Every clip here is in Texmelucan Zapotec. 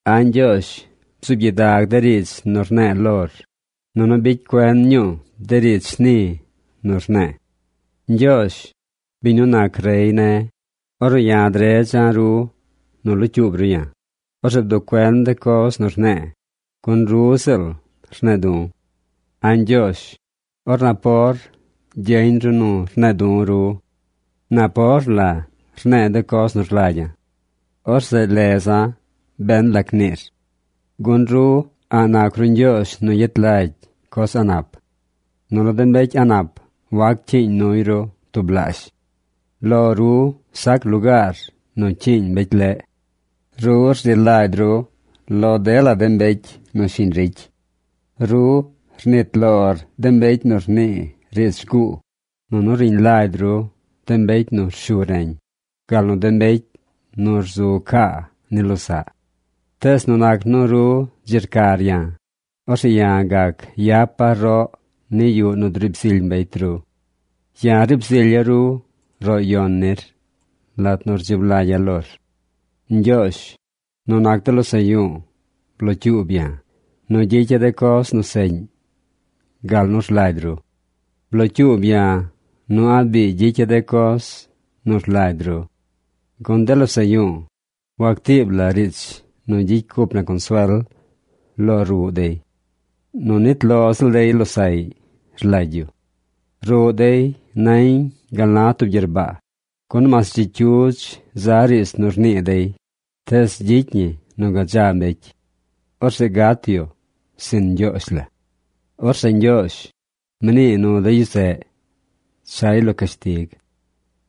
A̱ Ñgyoozh bzuub gyidag de riidz nu rne̱e̱ lor, nunu bicy cuen ñuu de riidz shni nu rne̱e̱. Ñgyoozh, biñ nu nac rey ne̱, ornu ya̱ dredza̱ ru nu locyuub ru ya̱, orzeꞌ bduꞌ cuen de coz nu rne̱e̱, gun ru ziꞌl rne̱e̱ du̱. A̱ Ñgyoozh, or napor gyeñ ru nu rne̱e̱ du̱ ru. Napor la rne̱e̱ de coz nu rlagya̱. Orzeꞌ leza̱ ben lac niir. Gun ru a̱ꞌ nac ru Ñgyoozh nu yet lagy coz a̱ꞌ nap. Nunu de mbecy a̱ꞌ nap wac cyiiñ nuy ru tublaazh. Lo ru sac lugaar nu cyiiñ mbecy leꞌ. Ru rzi lagy ru lo dela de mbecy nu shiñ ricy. Ru rnit lor de mbecy nu rnii riidz rguu, nunu riñ lagy ru de mbecy nu rshu reñ, gal nu de mbecy nu rzu caa ni losaꞌ. Tees nu nac nu ru dzi rcar ya̱, orzeꞌ ya̱ gac yapa̱ roꞌ ni yuꞌ nu driib zily mbecy ru. Ya̱ riib zilya̱ ru roꞌ yon nir lat nu rdzib lagya̱ lor. Ñgyoozh, nu nac de losaꞌ yu̱u̱ blocyuub ya̱ nu gyicya̱ de coz nu seꞌñ gal nu rlagy ru. Blocyuub ya̱ nu a̱ꞌ biigy gyicya̱ de coz nu rlagy ru. Gun de losaꞌ yu̱u̱, wactiib la riidz nu gyicy cup na consuel lo ruꞌ dey. Nu nit lo ziꞌl dey losaꞌy rlagy yu. Ruꞌ dey nañ gal na tub gyerbaa, gun mas dzi cyudz za riidz nu rnii dey, tees gyicy ñi nu gadza mbecy. Orzeꞌ gat yu sin Ñgyoozh la. Orzeꞌ Ñgyoozh, mnii nu de yu zeꞌ chay lo cashtig.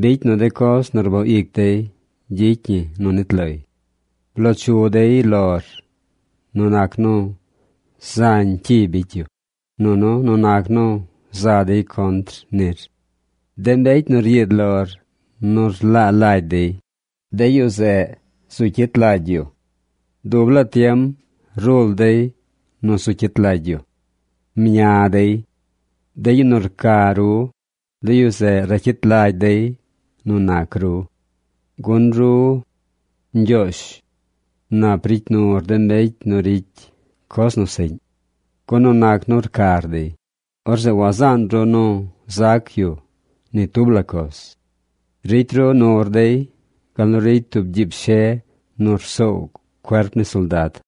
Bicy nu de coz nu rboo ic dey gyicy ñi nu nit loy. Bloo chu dey lor nu nac nu zañ cyi bicy yu, nunu nu nac nu za dey contr nir. De mbecy nu ryiid lor nu rlaa lagy dey, de yu zeꞌ zu cyit lagy yu. Dub laa tiem rul dey nu zu cyit lagy yu. Mña dey. De yu nu rca ru, de yu zeꞌ racyit lagy dey nu nac ru. Gun ru, Ñgyoozh, nap ricy nur de mbecy nu ricy coz nu seꞌñ. Gun nu nac nu rcar dey, orzeꞌ wazaan ru nu zac yu ni tub la coz. Ricy ru nur dey gal nu ricy tub gyiib she nu rsoow cuerp ni soldad.